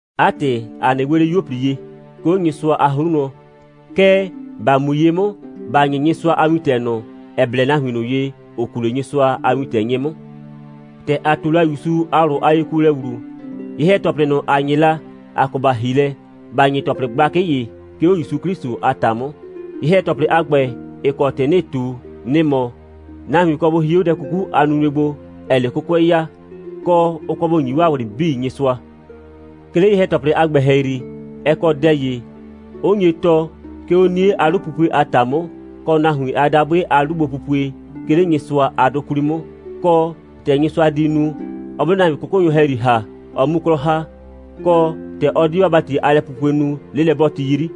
'A ‑tɩ, ‑a 'nɩ 'we 'le 'yuo꞊pli ye, 'ke 'o Nyɩsʋa a 'hru wlɔn, kɛɛ, ‑ba mu ye 'mʋ, ‑ba 'nyɩ Nyɩsʋa a wintɛ ꞊nʋ, ‑ɛ blɛ nahuin ꞊nʋ ye, ‑ʋ kuu 'le Nyɩsʋa a wintɛ 'nyɩ 'mʋ. ‑Tɛ ‑a ꞊tu la ‑Yusu a ꞊wlʋ a yekuolɛ ‑wlu, ye‑hɛ‑tɔplɩ ꞊nʋ, ‑a 'nyɩ la, ‑a kɔ ‑ba ‑hi lɛ, ‑ba 'nyɩ ‑tɔplɩ gblakɩ ‑ye, 'ke 'o ‑Yusu 'Klɩsʋ a ‑ta 'mʋ. Ye‑hɛ‑tɔplɩ a ‑gbɛ, ‑ɩ kɔ ‑tɩ 'nɩɩ ꞊tu, nɩ‑ mɔ: Nahuin kɔ bʋ hie 'o dɛ 'kuku a nunue gbo, ‑ɛɛ 'le 'kʋkʋɛ ya, kɔ, ʋ kɔ bʋ ‑nyi 'waa ꞊wlɩ 'bii Nyɩsʋa. 'Ke 'le ye‑hɛ‑tɔplɩ a ‑gbɛ ‑hɛyri, ɛ kɔ dɛ ‑ye, 'ʋ nye tɔɔ, 'ke 'o 'nie a 'lupupue a ‑ta 'mʋ, kɔ nahuin a dabʋɩ a 'lugbopupue, 'ke 'le Nyɩsʋa a 'dʋ 'kwli 'mʋ, kɔ, ‑tɛ Nyɩsʋa di nu, ɔ 'mʋ 'le nahuin 'kʋkʋnyʋ ‑hɛyri ‑ha, ɔ 'mu 'klɔ ‑ha, kɔ, ‑tɛ ɔ di 'waa ‑bati a lɛpupue nu, 'lelɛ'bɔɔti 'yri.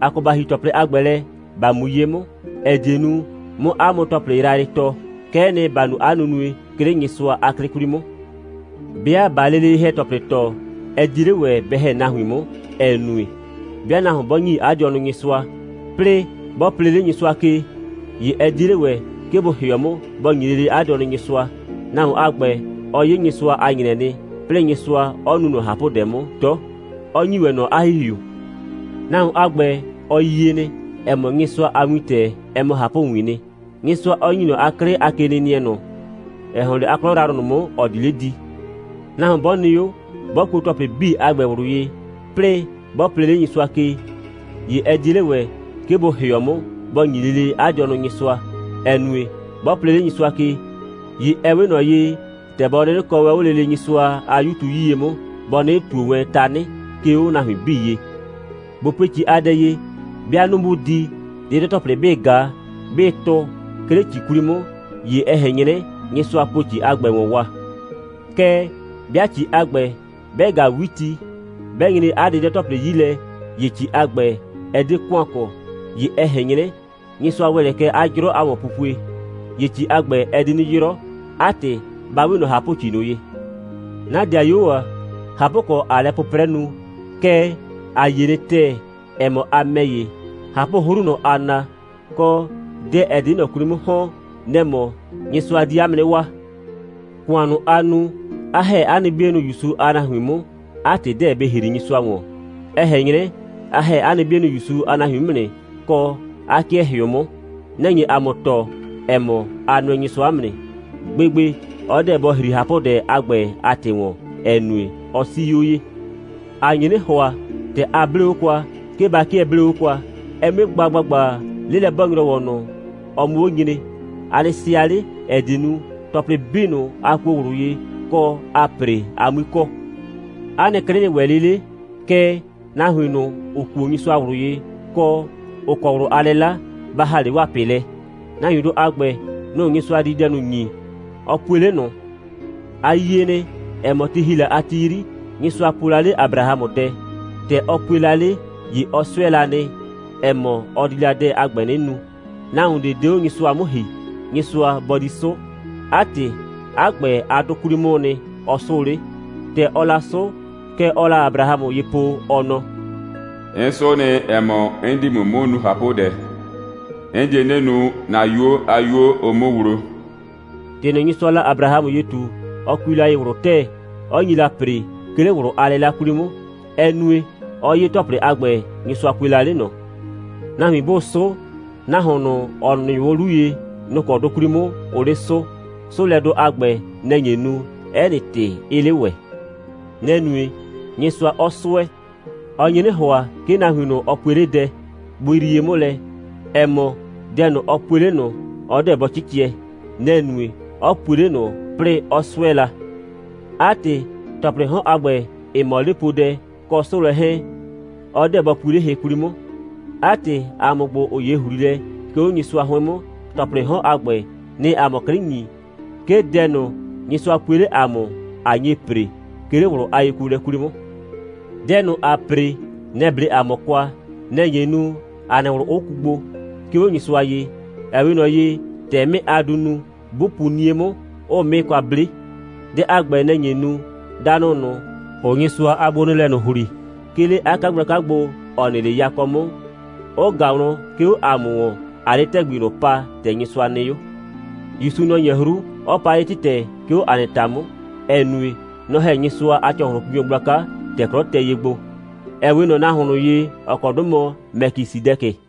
‑A kɔ ‑ba ‑hi ‑tɔplɩ a ‑gbɛ lɛ, ‑ba mu ye 'mʋ, ‑ɛ die nu, 'mʋ 'a mʋ ‑tɔplɩ yrayrɩ tɔɔ. Kɛ'ɛ nɩ, ‑ba nu 'a nunue, 'ke 'le Nyɩsʋa a 'klɩ 'kwli 'mʋ. 'Bɩa ꞊baa lele ye‑hɛ‑tɔplɩ tɔɔ, ɛ 'die 'le ‑wɛ bɛ ‑hɛ nahuin 'mʋ, ‑ɛ nue, 'bɩa nahuon 'bɔ ‑nyi 'a dɩɔnʋ Nyɩsʋa, 'plɩɩ 'bɔ plee 'le Nyɩsʋa ke, ‑ye ɛ 'die 'le ‑wɛ, 'ke bʋ ‑hɩɔ 'mʋ, bɔ ‑nyi lele 'a dɩɔnʋ Nyɩsʋa. Nahuon a ‑gbɛ, ɔ 'ye Nyɩsʋa a ‑nyrɛ nɩ, 'plɩɩ Nyɩsʋa 'ɔ nu ꞊nɔ ꞊hapʋdɛ 'mʋ 'dɔ, 'ɔ ‑nyi ‑wɛ ꞊nɔ 'a ‑Hihiu. Nahuon a ‑gbɛ, ɔ yie nɩ, ‑ɛ mɔ, Nyɩsʋa a wintɛ, ɛ mɔ ꞊hapʋwiin nɩ, Nyɩsʋa 'ɔ ‑nyi ꞊nɔ 'a 'klɩ a kenɩnɩɛ ꞊nʋ, ‑ɛ ‑hɔn 'le 'a 'klɔ yrayrʋ ꞊nʋ 'mʋ, ‑ɔ di 'le di. Nahuon 'bɔ nɩ 'o, 'bɔ kuo ‑tɔplɩ 'bii a ‑gbɛ ꞊wlʋ ye, 'plɩɩ 'bɔ plee 'le Nyɩsʋa ke, ‑ye ɛ 'die 'le ‑wɛ, 'ke bʋ ‑hɩɔ 'mʋ, bɔ ‑nyi lele 'a dɩɔnʋ Nyɩsʋa, ‑ɛ nue, 'bɔ plee 'le Nyɩsʋa ke, ‑ye ɛ 'we ꞊nɔ ye, ‑tɛ bɔ 'nɩnɩ kɔɔ wɛn 'o lele Nyɩsʋa a 'Yu tu 'yie 'mʋ, bɔ 'nɩnɩ ꞊tuo wɛn tanɩ, 'ke 'o nahuin 'bii ye. ꞊Bo pue ‑ci a dɛ ye. 'Bɩa 'nu 'bʋʋ di, 'dɩdɔ‑tɔplɩ 'bɩ ꞊ga, 'bɩ tʋ, 'ke 'le ‑ci 'kwli 'mʋ, ‑ye ɛ ꞊hɛn 'nyrɛ, Nyɩsʋa po ‑ci a ‑gbɛ ‑wɔn wa. Kɛɛ, 'bɩa ‑ci a ‑gbɛ, 'bɛ ꞊gaa 'witi, 'bɛ nyre 'a 'dɩdɔ‑tɔplɩ 'yi lɛ, ‑ye ‑ci a ‑gbɛ, ɛ 'de ‑kʋan kɔ. ‑Ye ɛ ꞊hɛn 'nyrɛ, Nyɩsʋa ‑wɛ lɛ kɛ 'a 'jrɔ a ‑wɔnpupue. ‑Ye ‑ci a ‑gbɛ, ɛ di 'nɩ 'yrɔ. 'A ‑tɩ, ‑ba 'we ꞊nɔ ꞊hapʋ‑ci ꞊nʋ ye. 'Na 'dɩayuo ‑a, ꞊hapʋkɔ, ꞊aa lɛ 'pʋprɛ nu, kɛɛ, ‑a yie nɩ ‑tɛɛ, ‑ɛ mɔ, a ‑mɛ ‑ye, ꞊hapʋ'hru, nʋ‑ aa na, kɔ, dɛ, ‑ɛ di 'le ꞊nɔ 'kwli 'mʋ ‑hɔn, nɛ‑ mɔ, Nyɩsʋa di 'a mʋ 'nɩ waa. ‑Kʋan ꞊nʋ, a nu, 'a ‑hɛ 'a nɩ 'bienʋ ‑Yusu a nahuin 'mʋ, 'a ‑tɩ 'deɛ bɩ ‑hri Nyɩsʋa ‑wɔn. Ɛ ꞊hɛn 'nyrɛ, a ‑hɛ 'a nɩ 'bienʋ ‑Yusu a nahuin 'mʋ nɩ, kɔ, 'a 'kɩɛ ‑hɩʋ 'mʋ. Nɛ‑ nye ‑a mʋ tɔɔ, ‑ɛ mɔ, a nʋɛ Nyɩsʋa 'mʋ nɩ. Gbegbe, ɔ 'deɛ bɔ ‑hri ꞊hapʋdɛ a ‑gbɛ a ‑tɩ ‑wɔn, ‑ɛ nue, ɔ 'sii 'o ye. ‑A nye 'nɩ ‑hʋa, ‑tɛ a 'blee 'o kwa, 'ke ba 'kɩɛ 'blee 'o kwa, ɛ 'mue gba ‑gbagba, 'lelɛ'bɔɔ‑nyrɔwɔ ꞊nʋ, ɔ 'mʋ 'o nyre. A nɩ sɩa 'le, ‑ɛ die nu, ‑tɔplɩ 'bii ꞊nʋ, a kuo ꞊wlʋ ye, kɔ, aa ‑pre, a 'mui kɔ. 'A nɩ 'klɩ nɩ ‑wɛ 'le 'le, kɛɛ, nahuin ꞊nʋ, ‑ʋ kuo Nyɩsʋa ꞊wlʋ ye, kɔ, ‑ʋ kɔ ꞊wlʋ a 'lɩla, ba ‑ha 'le 'waa ꞊pɩ lɛ. Nahuindʋ a ‑gbɛ, nʋ‑ Nyɩsʋa di dɛ ꞊nʋ ‑nyi, ɔ pue 'le ꞊nʋ. A yie nɩ, ‑ɛ mɔ, ti ‑hi la a ti 'yri, Nyɩsʋa po la 'le Abrahamʋ dɛ. ‑Tɛ ɔ pue la 'le, ‑ye ɔ 'sʋɛ la nɩ, ‑ɛ mɔ, ɔ di la dɛ a ‑gbɛ 'nɩ nu. Nahuon ꞊de 'de 'o Nyɩsʋa 'mʋ ‑hi, Nyɩsʋa bɔ di 'sʋʋ. 'A ‑tɩ, 'a ‑gbɛ a 'dʋ 'kwli 'mʋʋ nɩ, ɔ 'sʋʋ 'le. ‑Tɛ ɔɔ la 'sʋʋ, kɛ ɔɔ la Abrahamʋ ye po, ɔ nɔ: «'N 'sʋ nɩ, ‑ɛ mɔ, 'n di ‑mʋ 'mʋ nu ꞊hapʋdɛ. 'N die 'nɩ nu, ‑na 'yuo a 'yuo, ʋ 'mʋ wlo.» ‑Tɩ ꞊nʋ, Nyɩsʋaa la Abrahamʋ ye ꞊tu, ɔ kui la ye ꞊wlʋ ‑tɛɛ, 'ɔ nyi la ‑pre, 'ke 'le ꞊wlʋ a 'lɩla 'kwli 'mʋ. Ɛ nue, 'ɔ 'ye ‑tɔplɩ a ‑gbɛ, Nyɩsʋa pue la 'le ꞊nɔ. Nahuin 'bʋʋ 'sʋʋ, nahuon ꞊nʋ, ‑ɔ nɩʋ 'o 'lu ye, nɔ‑ kɔ 'dʋ 'kwli 'mʋ, ʋʋ 'le 'sʋʋ. 'Sʋʋlɛdʋ a ‑gbɛ, nɛ‑ nye nu, 'ɛ nɩ ‑tɩ 'ɩɩ 'le ‑wɛ. Nɛ‑ nue, Nyɩsʋa 'ɔ 'sʋɛ. Ɔ nye 'nɩ ‑hʋa, 'ke nahuin ꞊nʋ, ɔ pue 'le dɛ, bʋ yrie 'mʋ lɛ, ‑ɛ mɔ, dɛ ꞊nʋ, ɔ pue 'le ꞊nʋ, ɔ 'deɛ bɔ 'cɩcɩɛ. Nɛ‑ nue, 'ɔ pue 'le ꞊nʋ, 'plɩɩ 'ɔ 'sʋɛ la. 'A ‑tɩ, ‑tɔplɩɩ 'hɔn a ‑gbɛ, ‑ɩ mɔ 'lepoodɛ, kɔ 'sʋʋlɛ 'hɛɛn, ɔ 'deɛ bɔ pui 'le hɩ 'kwli 'mʋ. 'A ‑tɩ, ‑a mʋ ‑gbo, ‑ʋ 'ye ‑hliilɛ, 'ke 'o Nyɩsʋa 'hʋɩn 'mʋ, ‑tɔplɩɩ 'hɔn a ‑gbɛ, nɩ‑ɩ ‑a mʋ 'klɩ ‑nyi, 'ke dɛ ꞊nʋ, Nyɩsʋa pue 'le ‑a mʋ, ‑a nye ‑pre, 'ke 'le ꞊wlʋ a yekuolɛ 'kwli 'mʋ. Dɛ ꞊nʋ, ‑aa ‑pre, nɛ‑ 'ble ‑a mʋ kwa, nɛ‑ nye nu, ‑a nɩ ꞊wlʋ 'ʋ ku gbo, 'ke 'o Nyɩsʋa ye, ‑ɛ 'we ꞊nɔ ye, ‑tɛ 'mɩɩ a duu nu, 'bʋ pu 'nie 'mʋ, 'ʋʋ 'mɩɩ kwa 'ble. Dɛ a ‑gbɛ, nɛ‑ nye nu, danʋ ꞊nʋ, ‑ʋʋ Nyɩsʋa a gbonɩɩlɛ ꞊nʋ ‑hli, 'ke 'le 'a 'kagblaka gbo, ‑ɔ nɩ 'le yakɔ 'mʋ, 'ʋ ꞊ga wlɔn, 'ke 'o ‑a mʋ ‑wɔn, ꞊aa 'le ‑tɛgbi ꞊nʋ pa, ‑tɛ Nyɩsʋa nɩ 'o. ‑Yusu, nɔ‑ 'nyɛ 'hru, 'ɔ pa 'le ‑tɩtɛ, 'ke 'o ‑a nɩ ‑ta 'mʋ, ‑ɛ nue, nɔ‑ ‑hɛ Nyɩsʋa a ‑cɔhlʋnpinyɔ gblaka, ‑tɛ 'klɔ tɛ ye gbo, ‑ɛ 'we ꞊nɔ nahuon ꞊nʋ ye, ‑ɔ kɔ 'dʋ mɔ Mɛkisɩdɛkɩ.